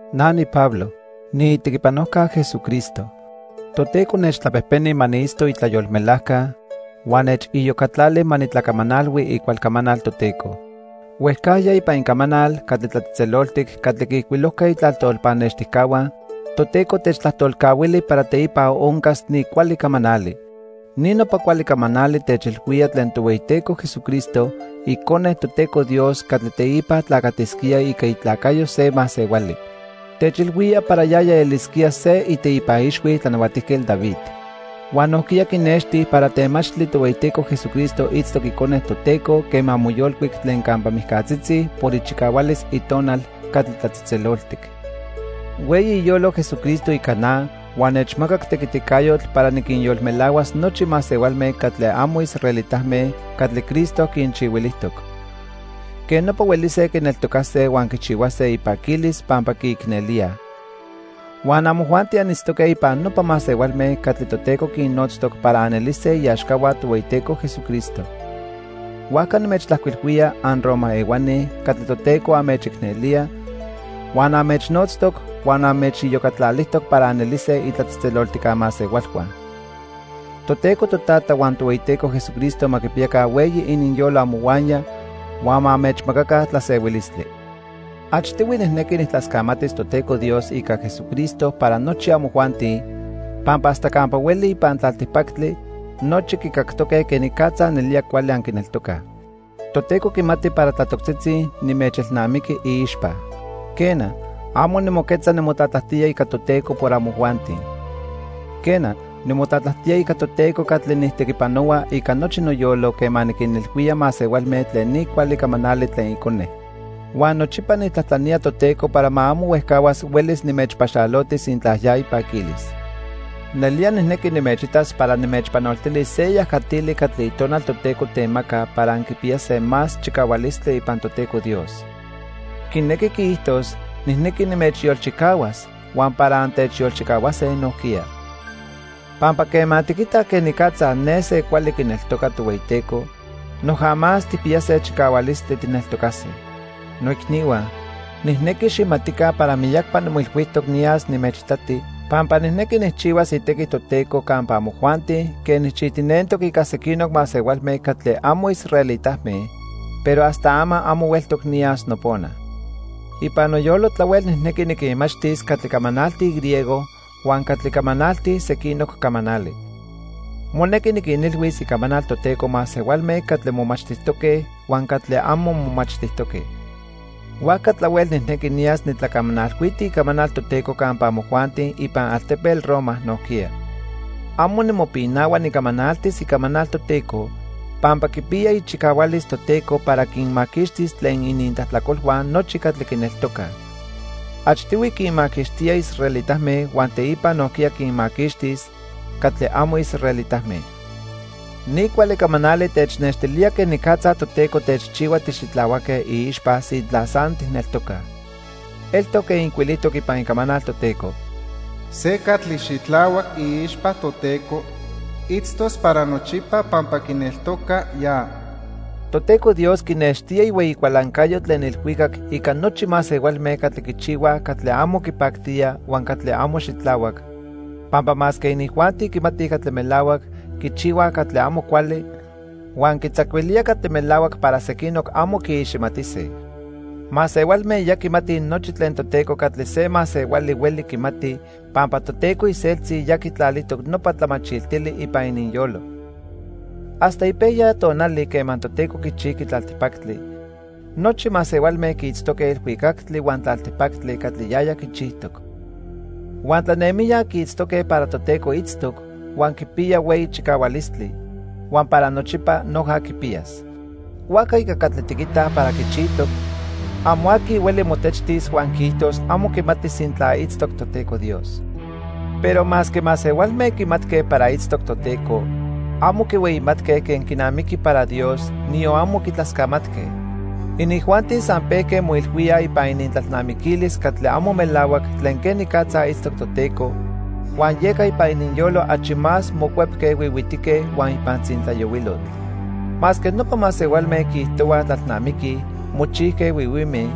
Na niPablo. Niitequipanojca Jesucristo. Toteco nechtlapejpeni ma niitzto itlayolmelajca, huan nechiyocatlali ma nitlacamanalhui icual camanal Toteco. Huejcajya ipan Icamanal catli tlatzejtzeloltic catli quiijcuilojque itlajtol pannextijca, Toteco techtlajtolcahuili para teipa oncas ni cuali camanali. Ni nopa cuali camanali techilhuía tlen Tohueyiteco Jesucristo, Icone Toteco Dios catli teipa tlacatisquía ica itlacayo se masehuali. Techilhuía para yaya elisquía se iteipa ixhui Tlanahuatijquetl David. Huan nojquiya quinexti para temachtli Tohueyiteco Jesucristo itztoc Icone Toteco quema moyolcuic tlen campa mijcatzitzi por ichicahualis Itonal catli tlatzejtzeloltic. Hueyi iyolo Jesucristo ica na huan nechmacac tequiticayotl para niquinyolmelahuas nochi masehualme catli amo israelitame catli Cristo quinchihuilijtoc. Quej nopa huelise quineltocase huan quichihuase ipaquilis pampa quiicnelíaj. Huan amojuanti anitztoque ipan nopa masehualme catli Toteco quinnotztoc para anelise iaxcahua Tohueyiteco Jesucristo. Huajca nimechtlajcuilhuía, anRoma ehuani catli Toteco anmechicnelía, huan anmechnotztoc huan anmechiyocatlalijtoc para anelise itlatzejtzeloltijca masehualhua. Toteco Totata huan Tohueyiteco Jesucristo ma quipiyaca hueyi ininyolo amohuaya huan ma anmechmacaca tlasehuilistli. Achtihui nijnequi nijtlascamatis Toteco Dios ica Jesucristo para nochi amojuanti, pampa hasta campa hueli ipan tlaltipactli, nochi quicactoque quenicatza nelía cuali anquineltocaj. Toteco quimati para tlatoctzitzi nimechelnamiqui iixpa. Quena, amo nimoquetza nimotlatlajtía ica Toteco para amojuanti. Quena, nimotlatlajtía ica Toteco catli nijtequipanohua ica nochi noyolo quema niquinilhuía masehualme tlen ni cuali camanali tlen Icone. Huan nochipa nijtlajtlanía Toteco para ma amo huejcahuas huelis nimechpaxaloti sintla ya ipaquilis. Nelía nijnequi nimechitas para nimechpanoltilis se yajatili catli Itonal Toteco temaca para anquipiyase más chicahualistli ipan Toteco Dios. Quinequi quiijtos nijnequi nimechyolchicahuas huan para antechyolchicahuase nojquiya. Pampa quema tiquitaj quenicatza ne se cuali quineltoca Tohueyiteco, noja más tijpiyase chicahualistli tijneltocase. Noicnihua, nijnequi xijmatica para miyacpa nimoilhuijtoc niyas nimechitati pampa nijnequi nijchihuas itequi Toteco campa amojuanti quen nijchijtinentoc ica sequinoc masehualme catli amo israelitame, pero hasta ama amo hueltoc niyas nopona. Ipan noyolo tlahuel nijnequi niquinmachtis catli camanaltij griego huan catli camanaltij sequinoc camanali. Monequi niquinilhuis icamanal Toteco masehualme catli momachtijtoque huan catli amo momachtijtoque. Huajca tlahuel nijnequi niyas nitlacamanalhuiti icamanal Toteco campa amojuanti ipan altepetl Roma nojquiya. Amo nimopinahua nicamanaltis icamanal Toteco, pampa quipiya ichicahualis Toteco para quinmaquixtis tlen inintlajtlacolhua nochi catli quineltocaj. Achtihui quinmaquixtía israelitame huan teipa nojquiya quinmaquixtis catli amo israelitame. Ni cuali camanali technextilía quenicatza Toteco techchihua tixitlahuaque iixpa sintla san tijneltocaj. Eltoc quen ijcuilijtoc ipan Icamanal Toteco: "Se catli xitlahuac iixpa Toteco, itztos para nochipa pampa quineltoca ya." Toteco Dios quinextía ihueyi cualancayo tlen ilhuicac ica nochi masehualme catli quichihuaj catli amo quipactía huan catli amo xitlahuac, pampa masque inijuanti quimatij catli melahuac, quichihuaj catli amo cuali, huan quitzacuilía catli melahuac para sequinoc amo quiiximatise. Masehualme ya quimatij nochi tlen Toteco catli se masehuali hueli quimati pampa Toteco iseltzi ya quitlalijtoc nopa tlamachiltili ipan ininyolo. Hasta ipejya tonali quema Toteco quichijqui tlaltipactli, nochi masehualme quiitztoque ilhuicactli huan tlaltipactli catli yaya quichijtoc. Huan tlanemijya quiitztoque para Toteco itztoc, huan quipiya hueyi chicahualistli, huan para nochipa noja quipiyas. Huajca ica catli tiquitaj para quichijtoc, amo aqui hueli motechtis huan quiijtos amo quimati sintla itztoc Toteco Dios. Pero masque masehualme quimatque para itztoc Toteco, amo quihueyimatque quen quinamiqui para Dios, niyon amo quitlascamatque. Inijuanti san pejque moilhuíaj ipan inintlalnamiquilis catli amo melahuac tlen quenicatza itztoc Toteco, huan yeca ipan ininyolo achi más mocuepque huihuitique huan ipan tzintlayohuilotl. Masque nopa masehualme quiijtohuaj tlalnamiquij, mochijque huihuime,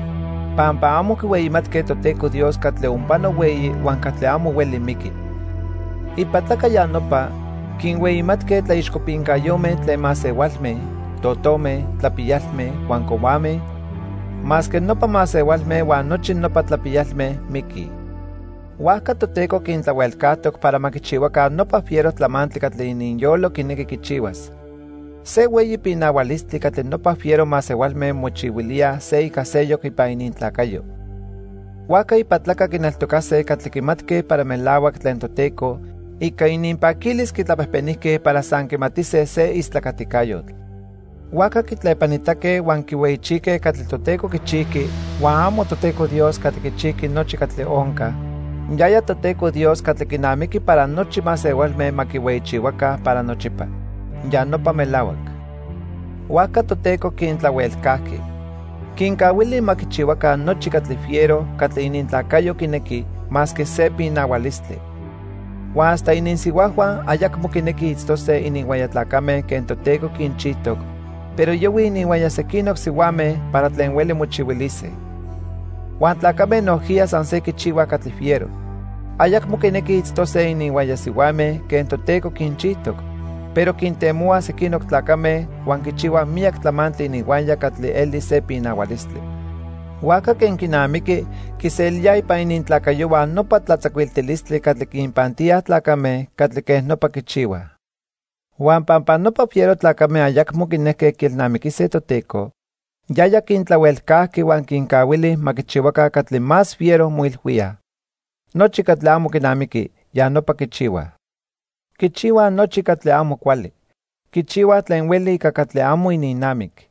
pampa amo quihueyimatque Toteco Dios catli onpano hueyi huan catli amo hueli miqui. Ipatlaca ya nopa, quinhueyimatque tlaixcopincayome tlen masehualme, totome, tlapiyalme huan cohuame, masque nopa masehualme huan nochi nopa tlapiyalme miquij. Huajca Toteco quintlahuelcajtoc para ma quichihuaca nopa fiero tlamantli catli ininyolo quinequi quichihuas. Se hueyi pinahualistli catli nopa fiero masehualme mochihuilíaj se ica seyoc ipan inintlacayo. Huajca ipatlaca quineltocase catli quimatque para melahuac tlen Toteco, ica ininpaquilis quitlapejpenijque para san quimatise se istlacaticayotl. Huajca quitlepanitaque huan quihueyichijque catli Toteco quichijqui huan amo Toteco Dios catli quichijqui nochi catli onca, yaya Toteco Dios catli quinamiqui para nochi masehualme ma quihueyichihuaca para nochipa. Ya nopa melahuac. Huajca Toteco quintlahuelcajqui. Quincahuilía ma quichihuaca nochi catli fiero catli inintlacayo quinequi, masque se pinahualistli. Huan hasta ininsihuajhua ayacmo quinequij itztose ininhuaya tlacame quen Toteco quinchijtoc, pero yohuij ininhuaya sequinoc sihuame para tlen hueli mochihuilise. Huan tlacame nojquiya san se quichihuaj catli fiero. Ayacmo quinequij itztose ininhuaya sihuame quen Toteco quinchijtoc, pero quintemohuaj sequinoc tlacame huan quichihuaj miyac tlamantli ininhuaya catli eli se pinahualistli. Huajca quen quinamiqui, quiselíaj ipan inintlacayohua nopa tlatzacuiltilistli catli quinpantíaj tlacame catli quen nopa quichihuaj. Huan pampa nopa fiero tlacame ayacmo quinejque quielnamiquise Toteco, yaya quintlahuelcajqui huan quincahuili ma quichihuaca catli más fiero moilhuíaj. Nochi catli amo quinamiqui, ya nopa quichihuaj. Quichihuaj nochi catli amo cuali. Quichihuaj tlen hueli ica catli amo ininnamic.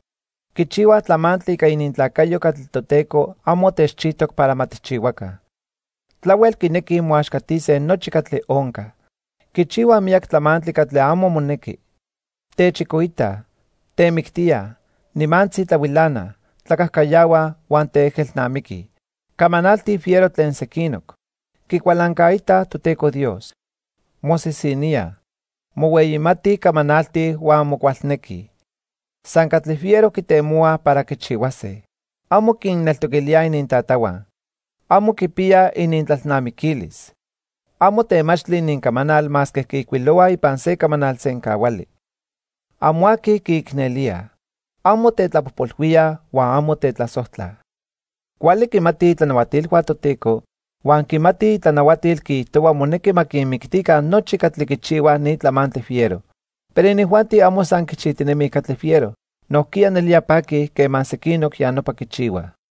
Quichihuaj tlamantli ica inintlacayo catli Toteco amo techchijtoc para ma tijchihuaca. Tlahuel quinequij moaxcatise nochi catli onca. Quichihuaj miyac tlamantli catli amo monequi. Techicoitaj, temictíaj, nimantzi tlahuilanaj, tlacajcayahuaj, huan teejelnamiquij. Camanaltij fiero tlen sequinoc. Quicualancaitaj Toteco Dios. Mosisiníaj. Mohueyimatij camanaltij huan mocualnequij. San catli fiero quitemohuaj para quichihuase. Amo quinneltoquilíaj inintatahua. Amo quipiyaj inintlalnamiquilis. Amo temachtli inincamanal masque quiijcuilohuaj ipan se camanal sencahuali. Amo aqui quiicnelíaj. Amo tetlapojpolhuíaj huan amo tetlasojtlaj. Cuali quimatij itlanahuatilhua Toteco huan quimati itlanahuatil quiijtohua monequi ma quinmictica nochi catli quichihuaj ni tlamantli fiero. Pero inijuanti amo san quichijtinemij catli fiero, nojquiya nelía paquij quema sequinoc ya nopa quichihuaj.